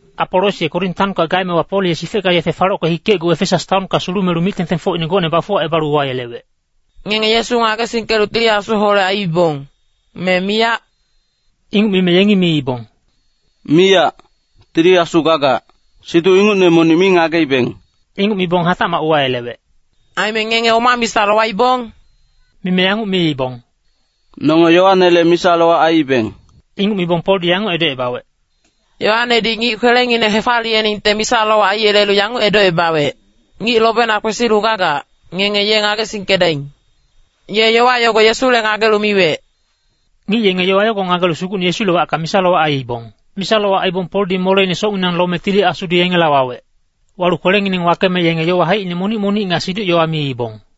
Apolos ye Korin taonka gaemewa Pol ye sifecka-yefe falocke hikecgu Efesas taonka sulumelu mic-tengtengfocine gocne bafuwacebalu uwayelewec, “Ngenge Yesu ngagesingkelu Tili Asuholec aiibong, me miyac?” Inguc mime yengi miibong, “Miyac, Tili Asu gagac, siduc ingucne monic mi ngageibeng.” Inguc mibong hatacmac uwayelewec, “Aime ngenge oma misa lowaibong?” Mime yanguc miibong, “Nonge Yoanele misa-lowac aiibeng.” Inguc mibong Poldi yanguc edocebawec, “Yoanedi ngic kwelengineng hefaliyeningte misa-lowac aiyelelu yanguc edocebawec, ‘Ngic lobena kwesilu gagac, ngenge ye ngagesingkedaing.’ Ye yowa yogo Yesule ngagelu miwec.” Ngic yenge yowa yogo ngagelu Sugucne Yesule wacka misa-lowac aiibong. Misa-lowac aibong Poldi moleine socnginang lome Tili Asudi yengela wawec. Walu kwelengineng wakeme yenge yowa haicine monic-monic nga siduc-yowa miibong.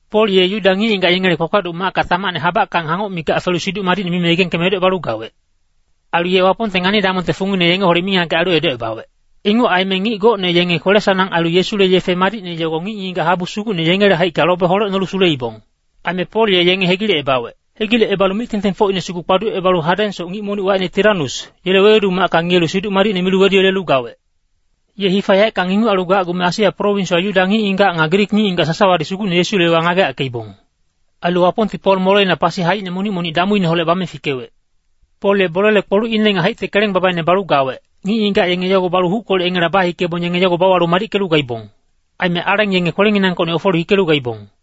Pol ye Yuda ngic-ngigac yengele kpakpaduc macka tamacne habackang hangoc mikac felu Siduc Madicne mime yegengkeme edocebalu gawec. Ailu ye Wapongte ngani-damongte fungine yengeholec mingagec ailu edocebawec. Inguc aime ngic gocne yenge kwele-sanang ailu Yesule yefe madicne yogo ngic-ngigac habu sugucne yengele haicka lobe holecnolu suleibong. Aime Pol ye yenge hegilecebawec. Hegilecebalu mic-tengtengfocine sugu kpaducebalu hadengsoc ngic monic wacine Tiranus, yele wewedu macka ngiyelu Siduc Madicne milu weduyelelu gawec. Ye hifa yaeckang inguc ailu gacgume Asia prowinswa Yuda ngic-ngigac nga Grik ngic-ngigac sasawadi Sugucne Yesule yowa ngageyackeibong. Ailu Wapongti Pol moleina pasi haicine monic-monic damuineholec bame fikewec. Pol ye bolele kpolucine nga haicte keleng babaine balu gawec, ngic-ngigac yenge yogo balu huckolec yengela bahikebong yenge yogo bauwalu madickelu gaibong. Aime aleng yenge kwelenginangkocni ofelu hikelu gaibong.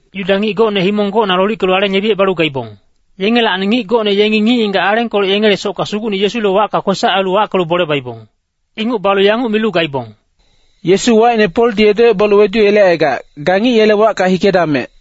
Yuda ngic gocne himong gocna lolickelu aleng yebicebalu gaibong. Yengelacni ngic gocne yengi ngic-ngigac alengkolec yengele socka Sugucne Yesule wacka kwesac ailu wackelu bole baibong. Inguc balu yanguc milu gaibong, “Yesu wacine Poldi edocebalu weduyelecaigac, ga ngic yele wacka hikedamec.”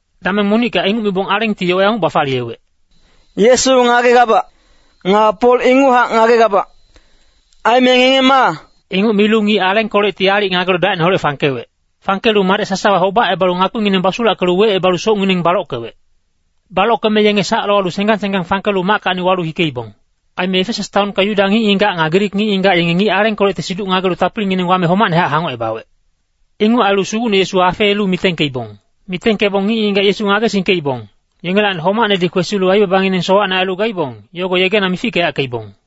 Dameng monicka inguc mibong alengti yowa yanguc bafaliyewec, “Yesu ngagegabac. Nga Pol inguchac ngagegabac. Aime ngenge ma?” Inguc milu ngic alengkolecti aalic ngagelu dacineholec fangkewec. Fangkelu madec sasawa hobacebalu ngakpingineng basulackelu wecebalu socngineng balockewec. Balockeme yenge sac lowalu senggang senggang fangkelu mackacni walu hikeibong. Aime Efesas taonka Yuda ngic-ngigac nga Grik ngic-ngigac yenge ngic alengkolecte siduc ngagelu tapilingineng wame homacnehac hangocebawec. Inguc ailu Sugucne Yesu afeelu mitengkeibong. Mitengkebong ngic-ngigac Yesu ngagesingkeibong, yengelacni homacnedi kwesilu aibabangineng sowacne ailu gaibong, yogo yegena mifickeyackeibong.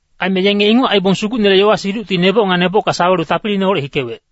Aime yenge inguc aibong Sugucnele yowa-siducti neboc nga nebocka sawelu tapiliineholec hikewec.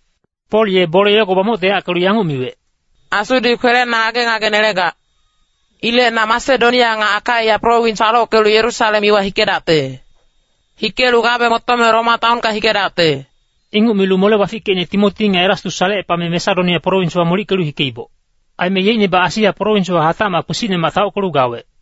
Pol ye bole yogo bamoctoyackelu yanguc miwec, “Asudi kwelena ngage-ngage nelegac. Ilec na Masedonia nga Akaia prowins falockelu Yerusalem iwa hikedacte. Hikelu gabe motome Roma taonka hikedacte.” Inguc milu mole-bafickecine Timoti nga Erastus salecepame Masedonia prowinswa molickelu hikeiboc. Aime yeicnebac Asia prowinswa hatacmac kpisicnemac taockelu gawec.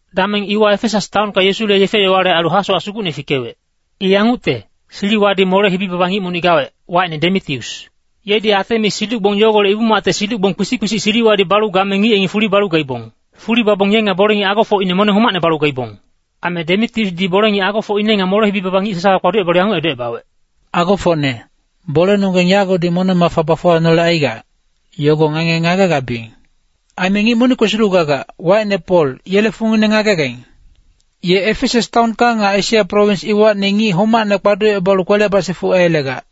Dameng iwa Efesas taonka Yesule yefe-yowale ailu hasowac sugucne fikewec. I yangucte, siliwadi mole-hibi baba ngic monic gawec, wacine Demitius. Yedi Atemis siduc-gbong yogolec ibu-macte siduc-gbong kpisic-kpisic siliwadi balu game ngic yengi fuli balu gaibong. Fuli babong ye nga bole-ngic agofocine moneng homacne balu gaibong. Aime Demitiusdi bole-ngic agofocine nga mole-hibi baba ngic sasawa kpaducebalu yanguc edocebawec, “Agofocne, bolenonggeng yagodi moneng-mafa bafuwanolecaigac, yogo ngenge ngagegabiyeng. Aime ngic monic kwesilu gagac, wacine Pol, yele fungine ngagegaing. Ye Efesas taonka nga Asia prowins iwacni ngic homacne kpaducebalu kwele basifuc aiyelegac.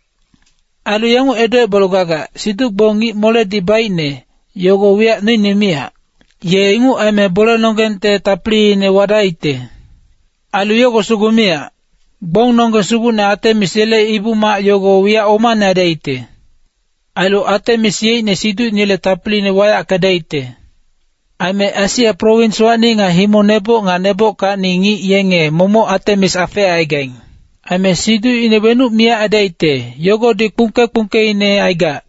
Ailu yanguc edocebalu gagac, ‘Siduc-gbong ngic-moledi baicne, yogo wiyac noine miyac.’ Ye inguc aime bolenonggengte tapiliine wadaicte. Ailu yogo sugu miyac. Gbongnonggeng sugucne Atemis yele ibu-mac yogo wiyac omane aidaicte. Ailu Atemis yeicne siducinele tapiliine wayackedaicte. Aime Asia prowinswacni nga himong neboc nga nebockacni ngic yenge momoc Atemis afeecaigaing. Aime siducine wenuc miyac aidaicte, yogodi kpungke-kpungkeine aigac.”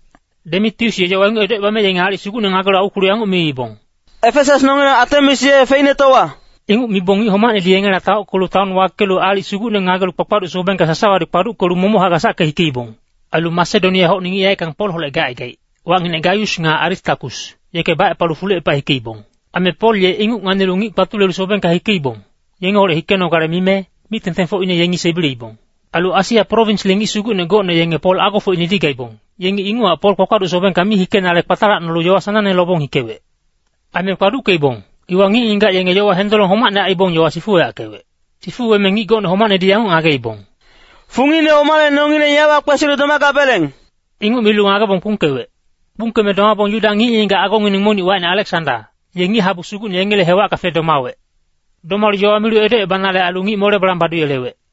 Demitius ye yowa inguc edocebame yenge aalic sugucne ngagelu aukwelu yanguc miibong, “Efesas nongileng Atemis ye feicnetowa!” Inguc mibong ngic homacnedi yengela taockelu taon wakelu aalic sugucne ngagelu kpakpaduc sobengka sasawadi kpaduckelu momochac gasacke hikeibong. Ailu Masedonia-hocni ngic yaeckang Polholec gacaigaic, wacnginec Gaius nga Aristakus, yeke bacepalu fulucepa hikeibong. Aime Pol ye inguc ngagelu ngic kpatulelu sobengka hikeibong, yengeholec hikenogale mime, mic-tengtengfocine yengi sebileibong. Ailu Asia prowinsle ngic sugucne gocne yenge Pol agofocinedi gaibong, yengi inguchac Pol kpakpaduc sobengka mi hikenale kpatalacnolu yowa sanangne lobong hikewec. Aime kpaduckeibong, iwa ngic-ngigac yenge yowa hendolong homacne aibong yowa sifuweyackewec. Sifuweme ngic gocne homacnedi yanguc ngageibong, “Fungine omale nongileng yawa kwesilu domagabeleng?” Inguc milu ngagebong kpungkewec. Kpungkeme domabong Yuda ngic-ngigac agongineng monic wacine Aleksanda, ye ngic-habu sugucne yengele hewacka fedomawec. Domalu yowa milu edocebanale ailu ngic mole balang baduyelewec.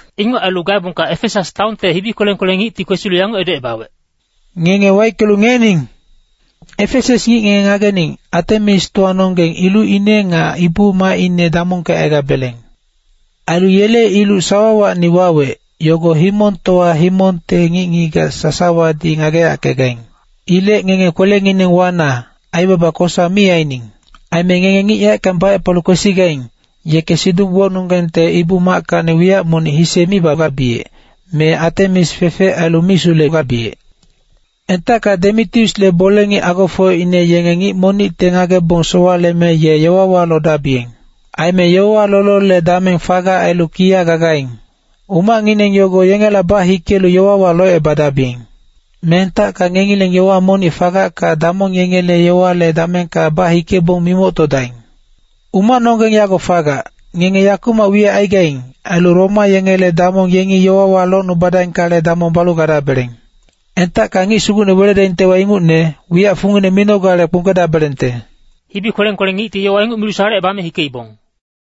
Inguc ailu gaebongka Efesas taonte hibi kweleng-kweleng ngicti kwesilu yanguc edocebawec, “Ngenge waickelu ngiyening! Efesas ngic ngenge ngagening, Atemistowanonggeng ilucine nga ibu-macine damongkecaigabeleng. Ailu yele iluc sawawacni wawec, yogo himongtowa himongte ngic-ngigac sasawadi ngageyackegaing. Ilec ngenge kwelengineng wana, aibaba kosa mi aining. Aime ngenge ngic yaeckang bacepalu kwesigaing, yeke siduc-gbongnonggengte ibu-mackacni wiyac monic hise mi bagabiyec, me Atemis fecfec ailu mi sulegabiyec. Entacka Demitiusle bole-ngic agofocine yenge ngic monicte ngagebong sowaleme ye yowawa lodabiyeng. Aime yowawa lolole dameng fagac ailu kiya gagaing. Umacngineng yogo yengela bahikelu yowawa locebadabiyeng. Me entacka ngengileng yowa monic fagacka damong yengele yowale damengka bahikebong mimoctodaing. Umacnonggeng yago fagac, ngenge yakumac wiyac aigaing, ailu Roma yengele damong yengi yowawa locnubadaingkale damong balu gadabeleng. Entacka ngic sugucne weledaingtewa ingucne, wiyac fungine minogale kpungkedabelengte.” Hibi kweleng-kweleng ngicti yowa inguc milu salecebame hikeibong.